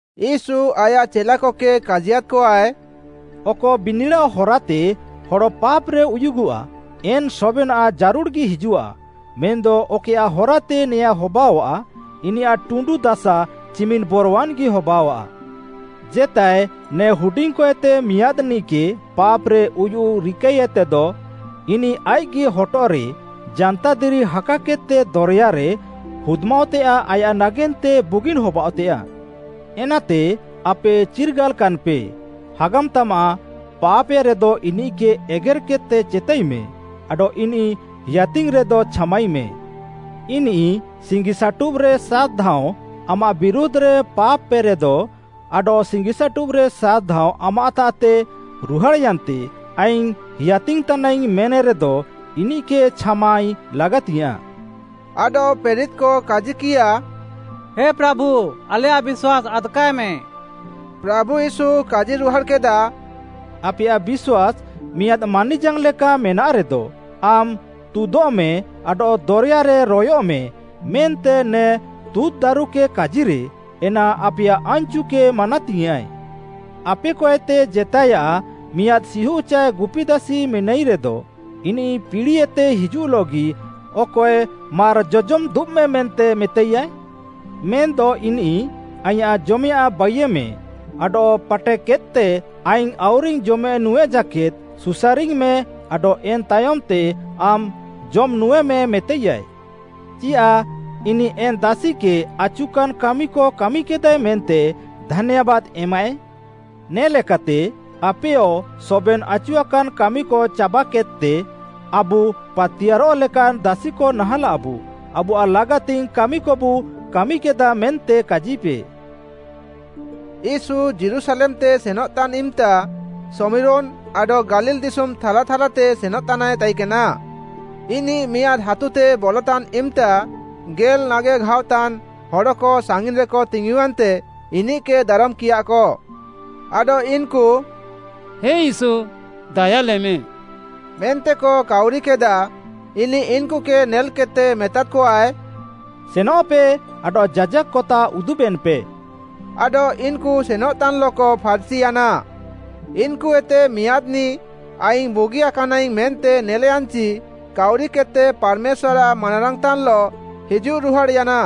ୟୀଶୁ ଆୟାଃ ଚେଲାକକେ କାଜିୟାଦ୍‌କଆଏ, “ଅକ ବିନିଡ଼ାଅ ହରାତେ ହଡ଼ ପାପ୍‌ରେ ଉୟୁଗଃଆ, ଏନ୍‌ ସବେନାଃ ଜାରୁଡ଼୍‌ଗି ହିଜୁଃଆ, ମେନ୍‌ଦ ଅକଏୟାଃ ହାରାତେ ନେୟାଁ ହବାଅଃଆ, ଇନିୟାଃ ଟୁଣ୍ଡୁ ଦାସା ଚିମିନ୍‌ ବରୱାନ୍‌ଗି ହବାଅଃଆ। ଜେତାଏ ନେ ହୁଡିଙ୍ଗ୍‌କଏତେ ମିଆଁଦ୍‌ନିଃକେ ପାପ୍‌ରେ ଉୟୁଃ ରିକାଇଏତେଦ, ଇନିଃ ଆଇଃଗି ହଟଃରେ ଜାନ୍ତାଦିରି ହାକାକେଦ୍‌ତେ ଦରେୟାରେ ହୁଦ୍‌ମାଅଃତେୟାଃ ଆୟାଃ ନାଗେନ୍ତେ ବୁଗିନ୍‌ ହବାଅଃତେୟାଃ। ଏନାତେ ଆପେ ଚିର୍ଗାଲ୍‌କାନ୍‌ପେ, ହାଗାମ୍ ତାମାଃ ପାପ୍‌ଏରେଦ ଇନିଃକେ ଏଗେର୍‌କେଦ୍‌ତେ ଚେତାଇମେଁ, ଆଡଃ ଇନିଃ ହେୟାତିଙ୍ଗ୍‌ରେଦଃ ଛାମାଇମେଁ। ଇନିଃ ସିଙ୍ଗିସାଟୁବ୍‌ରେ ସାତ୍‌ଧାଅଁଁ ଆମାଃ ବିରୁଧ୍‌ରେ ପାପ୍‌ପେରେଦ, ଆଡଃ ସିଙ୍ଗିସାଟୁବ୍‌ରେ ସାତ୍‌ଧାଅଁଁ ଆମାଃତାଃତେ ରୁହାଡ଼୍‌ୟାନ୍ତେ ଆଇଙ୍ଗ୍‌ ହେୟାତିଙ୍ଗ୍‌ତାନାଇଙ୍ଗ୍‌ ମେନ୍‌ରେଦ ଇନିଃକେ ଛାମାଇ ଲାଗାତିଙ୍ଗ୍‌ୟାଁଃ।” ଆଡଃ ପ୍ରେରିତ୍‌କ କାଜିକିୟା, “ହେ ପ୍ରାଭୁ ଆଲେୟାଃ ବିଶ୍ୱାସ୍‌ ଆଦ୍‌କାଏମେ।” ପ୍ରାଭୁ ୟୀଶୁ କାଜିରୁହାଡ଼୍‌କେଦା, “ଆପେୟାଃ ବିଶ୍ୱାସ୍‌ ମିଆଁଦ୍‌ ମାନିଜାଙ୍ଗ୍‌ଲେକା ମେନାଃରେଦ, ଆମ୍‌ ତୁଦଃମେଁ ଆଡଃ ଦରେୟାରେ ରୟଃମେ ମେନ୍ତେ ନେ ତୁଁତ୍‌ଦାରୁକେ କାଜିରେ, ଏନା ଆପେୟାଃ ଆନ୍‌ଚୁକେ ମାନାତିୟାଁଃଏ। “ଆପେକଏତେ ଜେତାଏୟାଃ ମିଆଁଦ୍‌ ସିହୁଃ ଚାଏ ଗୁପି ଦାସି ମେନାଇରେଦ, ଇନିଃ ପିଡ଼ିଏତେ ହିଜୁଃଲଃଗି, ଅକଏ ମାର୍‌ ଜଜମ୍‌ ଦୁବ୍‌ମେଁ ମେତାଇୟାଏ? ମେନ୍‌ଦ ଇନିଃ ‘ଆଇଁୟାଃ ଜମେୟାଃଁ ବାଇୟେମେଁ, ଆଡଃ ପାଟେକେଦ୍‌ତେ ଆଇଙ୍ଗ୍‌ ଆଉରିଙ୍ଗ୍‌ ଜମେ ନୁଁଏ ଜାକେଦ୍‌ ସୁସାରିଙ୍ଗ୍‌ମେ ଆଡଃ ଏନ୍‌ ତାୟମ୍‌ତେ ଆମ୍‌ ଜମ୍‌ନୁଁଏମେ’ ମେତାଇୟାଏ। ଚିୟାଃ ଇନିଃ ଏନ୍‌ ଦାସିକେ ଆଚୁକାନ୍‌ କାମିକ କାମିକେଦାଏ ମେନ୍ତେ ଧାନ୍ୟାବାଦ୍‌ ଏମାଃଏ? ନେ'ଲେକାତେ ଆପେୟ ସବେନ୍‌ ଆଚୁଆକାନ୍‌ କାମିକ ଚାବାକେଦ୍‌ତେ, ଆବୁ ପାତିୟାର୍‌ରଃ ଲେକାନ୍‌ ଦାସିକ ନାହାଁଲାବୁ, ଆବୁଆଃ ଲାଗାତିଙ୍ଗ୍‌ କାମିକବୁ କାମିକେଦାଃ ମେନ୍ତେ କାଜିପେ।” ୟୀଶୁ ଯୀରୁଶାଲେମ୍‌ତେ ସେନଃତାନ୍‌ ଇମ୍‌ତା, ଶମିରୋନ୍‌ ଆଡଃ ଗାଲିଲ୍‌ ଦିଶୁମ୍‌ ଥାଲା ଥାଲାତେ ସେନଃତାନାଏ ତାଇକେନା। ଇନିଃ ମିଆଁଦ୍‌ ହାତୁତେ ବଲତାନ୍‌ ଇମ୍‌ତା ଗେଲ୍‌ ନାଗେଘାଅତାନ୍‌ ହଡ଼କ ସାଙ୍ଗିନ୍‌ରେକ ତିଙ୍ଗୁୟାନ୍ତେ ଇନିଃକେ ଦାରମ୍‌କିୟାଃକ। ଆଡଃ ଇନ୍‌କୁ “ହେ ୟୀଶୁ ଦାୟାଲେମେଁ” ମେନ୍ତେକ କାଉରିକେଦାଃ। ଇନିଃ ଇନ୍‌କୁକେ ନେଲ୍‌କେଦ୍‌ତେ ମେତାଦ୍‌କଆଏ, “ସେନଃପେ ଆଡଃ ଯାଜାକ୍‌କତାଃ ଉଦୁବେନ୍‌ପେ।” ଆଡଃ ଇନ୍‌କୁ ସେନଃତାନ୍‌ଲଃକ ଫାର୍‌ଚିୟାନା। ଇନ୍‌କୁଏତେ ମିଆଁଦ୍‌ନିଃ ଆଇଙ୍ଗ୍‌ ବୁଗିକାନାଇଙ୍ଗ୍‌ ମେନ୍ତେ ନେଲ୍‌ୟାନ୍‌ଚି କାଉରିକେଦ୍‌ତେ ପାର୍‌ମେଶ୍ୱାର୍‌ଆଃ ମାନାରାଙ୍ଗ୍‌ତାନ୍‌ଲଃ ହିଜୁଃରୁହାଡ଼୍‌ୟାନା।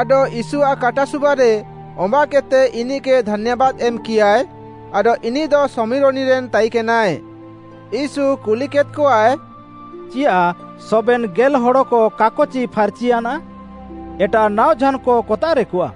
ଆଡଃ ୟୀଶୁଆଃ କାଟାସୁବାରେ ଅମ୍ବାଃକେଦ୍‌ତେ ଇନିଃକେ ଧାନ୍ୟାବାଦ୍‌ ଏମ୍‌କିୟାଏ, ଆଡଃ ଇନିଃଦ ଶମିରୋନିରେନ୍‌ ତାଇକେନାଏ। ୟୀଶୁ କୁଲିକେଦ୍‌କଆଏ, “ଚିୟାଃ ସବେନ୍‌ ଗେଲ୍‌ ହଡ଼କ କାକଚି ଫାର୍‌ଚିୟାନା? ଏଟାଃ ନାଅଝାନ୍‌କ କତାଃରେକଆଃ?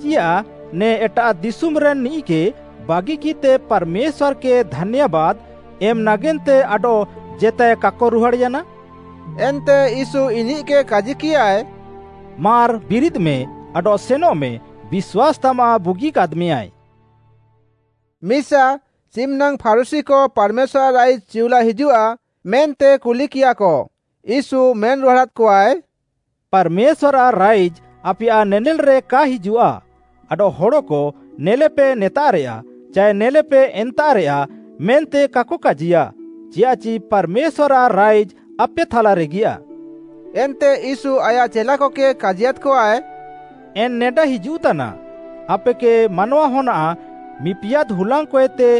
ଚିୟାଃ ନେ ଏଟାଃ ଦିଶୁମ୍‌ରେନ୍‌ ନିଃକେ ବାଗିକିଃତେ ପାର୍‌ମେଶ୍ୱାର୍‌କେ ଧାନ୍ୟାବାଦ୍‌ ଏମ୍‌ ନାଗେନ୍ତେ ଆଡଃ ଜେତାଏ କାକ ରୁହାଡ଼୍‌ୟାନା?” ଏନ୍ତେ ୟୀଶୁ ଇନିଃକେ କାଜିକିୟାଏ, “ମାର୍‌ ବିରିଦ୍‌ମେ ଆଡଃ ସେନଃମେ ବିଶ୍ୱାସ୍‌ତାମାଃ ବୁଗିକାଦ୍‌ମେୟାଏ।” ମିସା, ଚିମ୍‌ନାଙ୍ଗ୍‌ ଫାରୁଶୀକ ପାର୍‌ମେଶ୍ୱାର୍‌ଆଃ ରାଇଜ୍‌ ଚିଉଲା ହିଜୁଃଆ ମେନ୍ତେ କୁଲିକିୟାଃକ, ୟୀଶୁ ମେନ୍‌ରୁହାଡ଼ାଦ୍‌କଆଏ, “ପାର୍‌ମେଶ୍ୱାର୍‌ଆଃ ରାଇଜ୍‌ ଆପେୟାଃ ନେନେଲ୍‌ରେ କା ହିଜୁଃଆ, ଆଡଃ ହଡ଼କ ନେଲେପେ ନେତାଃରେୟା, ଚାଏ ନେଲେପେ ଏନ୍ତାଃରେୟା, ମେନ୍ତେ କାକ କାଜିୟା, ଚିୟାଃଚି ପାର୍‌ମେଶ୍ୱାର୍‌ଆଃ ରାଇଜ୍‌ ଆପେ ଥାଲାରେଗିୟା।” ଏନ୍ତେ ୟୀଶୁ ଆୟାଃ ଚେଲାକକେ କାଜିୟାଦ୍‌କଆଏ, “ଏନ୍‌ ନେଡା ହିଜୁଃତାନା, ଆପେକେ ମାନୱାହନ୍‌ଆଃ ମିପିୟାଦ୍‌ ହୁଲାଙ୍ଗ୍‌କଏତେ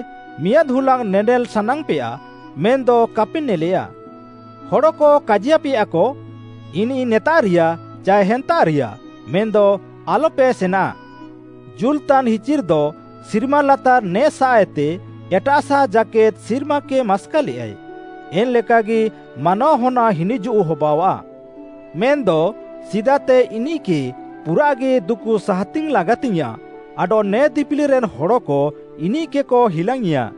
ମିଆଁଦ୍‌ ହୁଲାଙ୍ଗ୍‌ ନେନେଲ୍‌ ସାନାଙ୍ଗ୍‌ପେୟା, ମେନ୍‌ଦ କାପେ ନେଲେୟା। ହଡ଼କ କାଜିୟାପେୟାକ, ‘ଇନିଃ ନେତାଃରିୟା, ଚାଏ ହେନ୍ତାଃରିୟା,’ ମେନ୍‌ଦ ଆଲ୍‌ପେ ସେନାଃ। ଜୁଲ୍‌ତାନ୍‌ହିଚିର୍‌ଦ ସିର୍ମାଲାତାର୍‌ ନେ'ସାଃଏତେ ଏଟାଃସାଃ ଜାକେଦ୍‌ ସିର୍ମାକେ ମାସ୍କାଲେୟାଏ, ଏନ୍‌ ଲେକାଗି ମାନୱାହନ୍‌ଆଃ ହିନିଜୁଃ ହବାଅଆଃ। ମେନ୍‌ଦ ସିଦାତେ ଇନିଃକେ ପୁରାଃଗି ଦୁକୁ ସାହାତିଙ୍ଗ୍‌ ଲାଗାତିଙ୍ଗ୍‌ୟାଁଃ ଆଡଃ ନେ ଦିପିଲିରେନ୍‌ ହଡ଼କ ଇନିଃକେକ ହିଲାଙ୍ଗ୍‌ଇଁଆ।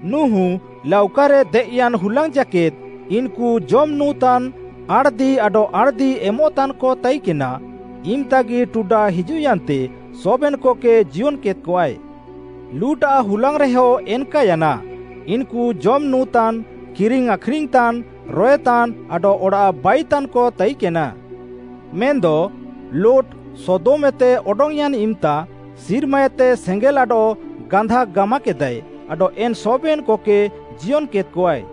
ନୁହୁଁ ଲାଉକାରେ ଦେଏଃୟାନ୍‌ ହୁଲାଙ୍ଗ୍‌ ଜାକେଦ୍‌ ଇନ୍‌କୁ ଜମ୍‌ ନୁଁତାନ୍ ଆଣ୍‌ଦି ଆଡଃ ଆଣ୍‌ଦିଏମଃତାନ୍‌କ ତାଇକେନା, ଇମ୍‌ତାଗି ଟୁଡା ହିଜୁଃୟାନ୍ତେ ସବେନ୍‌କକେ ଜିୟନ୍‌କେଦ୍‌କଆଏ। ଲୁଟ୍‌ଆଃ ହୁଲାଙ୍ଗ୍‌ରେହ ଏନ୍‌କାୟାନା, ଇନ୍‌କୁ ଜମ୍ ନୁଁତାନ୍, କିରିଙ୍ଗ୍‌ ଆଖ୍‌ରିଙ୍ଗ୍‌ତାନ୍‌, ରଏତାନ୍‌ ଆଡଃ ଅଡ଼ାଃ ବାଇତାନ୍‌କ ତାଇକେନା। ମେନ୍‌ଦ ଲୁଟ୍‌ ସୋଦମ୍‌ ଏତେ ଅଡଙ୍ଗ୍‌ୟାନ୍‌ ଇମ୍‌ତା ସିର୍ମାଏତେ ସେଙ୍ଗେଲ୍‌ ଆଡଃ ଗାନ୍ଧାକ୍‌ ଗାମାକେଦାଏ ଆଡଃ ଏନ୍‌ ସବେନ୍‌କକେ ଜିୟନ୍‌ କେଦ୍‌କଆଏ।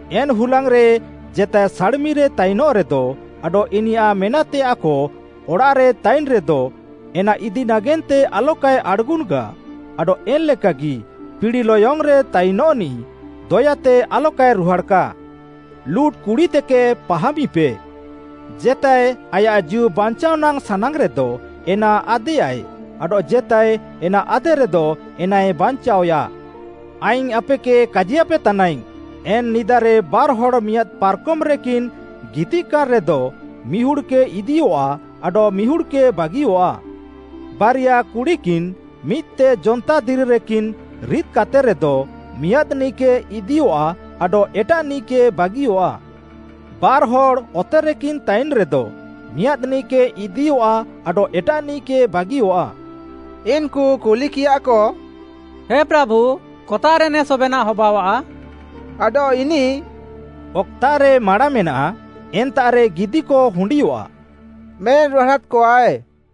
“ଏନ୍‌ ହୁଲାଙ୍ଗ୍‌ରେ ଜେତାଏ ସାଡ଼୍‌ମିରେ ତାଇନଃରେଦ ଆଡଃ ଇନିୟାଃ ମେନାଃତେୟାଃକ ଅଡ଼ାଃରେ ତାଇନ୍‌ରେଦ, ଏନା ଇଦିନାଗେନ୍ତେ ଆଲକାଏ ଆଡ଼୍‌ଗୁନ୍‌କା, ଆଡଃ ଏନ୍‌ଲେକାଗି ପିଡ଼ିଲୟଙ୍ଗ୍‌ରେ ତାଇନ୍‌ନିଃ ଦୟାତେ ଆଲକାଏ ରୁହାଡ଼୍‌କା। ଲୁଟ୍‌ କୁଡ଼ିତେକେ ପାହାମିପେ। ଜେତାଏ ଆୟାଃ ଜୀଉ ବାଞ୍ଚାଅ ନାଙ୍ଗ୍‌ ସାନାଙ୍ଗ୍‌ରେଦ ଏନା ଆଦେୟାଏ, ଆଡଃ ଜେତାଏ ଏନା ଆଦେରେଦ ଏନାଏ ବାଞ୍ଚାଅୟା। ଆଇଙ୍ଗ୍‌ ଆପେକେ କାଜିୟାପେ ତାନାଇଙ୍ଗ୍‌, ଏନ୍‌ ନିଦାରେ ବାର୍‌ହଡ଼୍‌ ମିଆଁଦ୍‌ ପାର୍‌କମ୍‌ରେକିନ୍‌ ଗିତିଃକାନ୍‌ରେଦ ମିହୁଡ଼୍‌କେ ଇଦିୟଃଆ ଆଡଃ ମିହୁଡ଼୍‌କେ ବାଗିଅଃଆ। ବାରିଆ କୁଡ଼ିକିନ୍‌ ମିଦ୍‌ତେ ଜନ୍ତାଦିରିରେକିନ୍‌ ରିଦ୍‌କାତେରେଦ ମିଆଁଦ୍‌ନିଃକେ ଇଦିୟଃଆ ଆଡଃ ଏଟାଃନିଃକେ ବାଗିଅଃଆ। ବାର୍‌ହଡ଼୍‌ ଅତେରେକିନ୍‌ ତାଇନ୍‌ରେଦ ମିଆଁଦ୍‌ନିଃକେ ଇଦିୟଃଆ ଆଡଃ ଏଟାଃନିଃକେ ବାଗିଅଃଆ।” ଇନ୍‌କୁ କୁଲିକିୟାଃକ, “ହେ ପ୍ରାଭୁ କତାଃରେ ନେ ସବେନାଃ ହବାଅଆଃ?” ଆଡଃ ଇନିଃ “ଅକ୍‌ତାଃରେ ମାଁଡ଼ା ମେନାଃ, ଏନ୍ତାଃରେ ଗିଦିକ ହୁଣ୍ଡିୟଃଆଃ” ମେନ୍‌ରୁହାଡ଼ାଦ୍‌କଆଏ।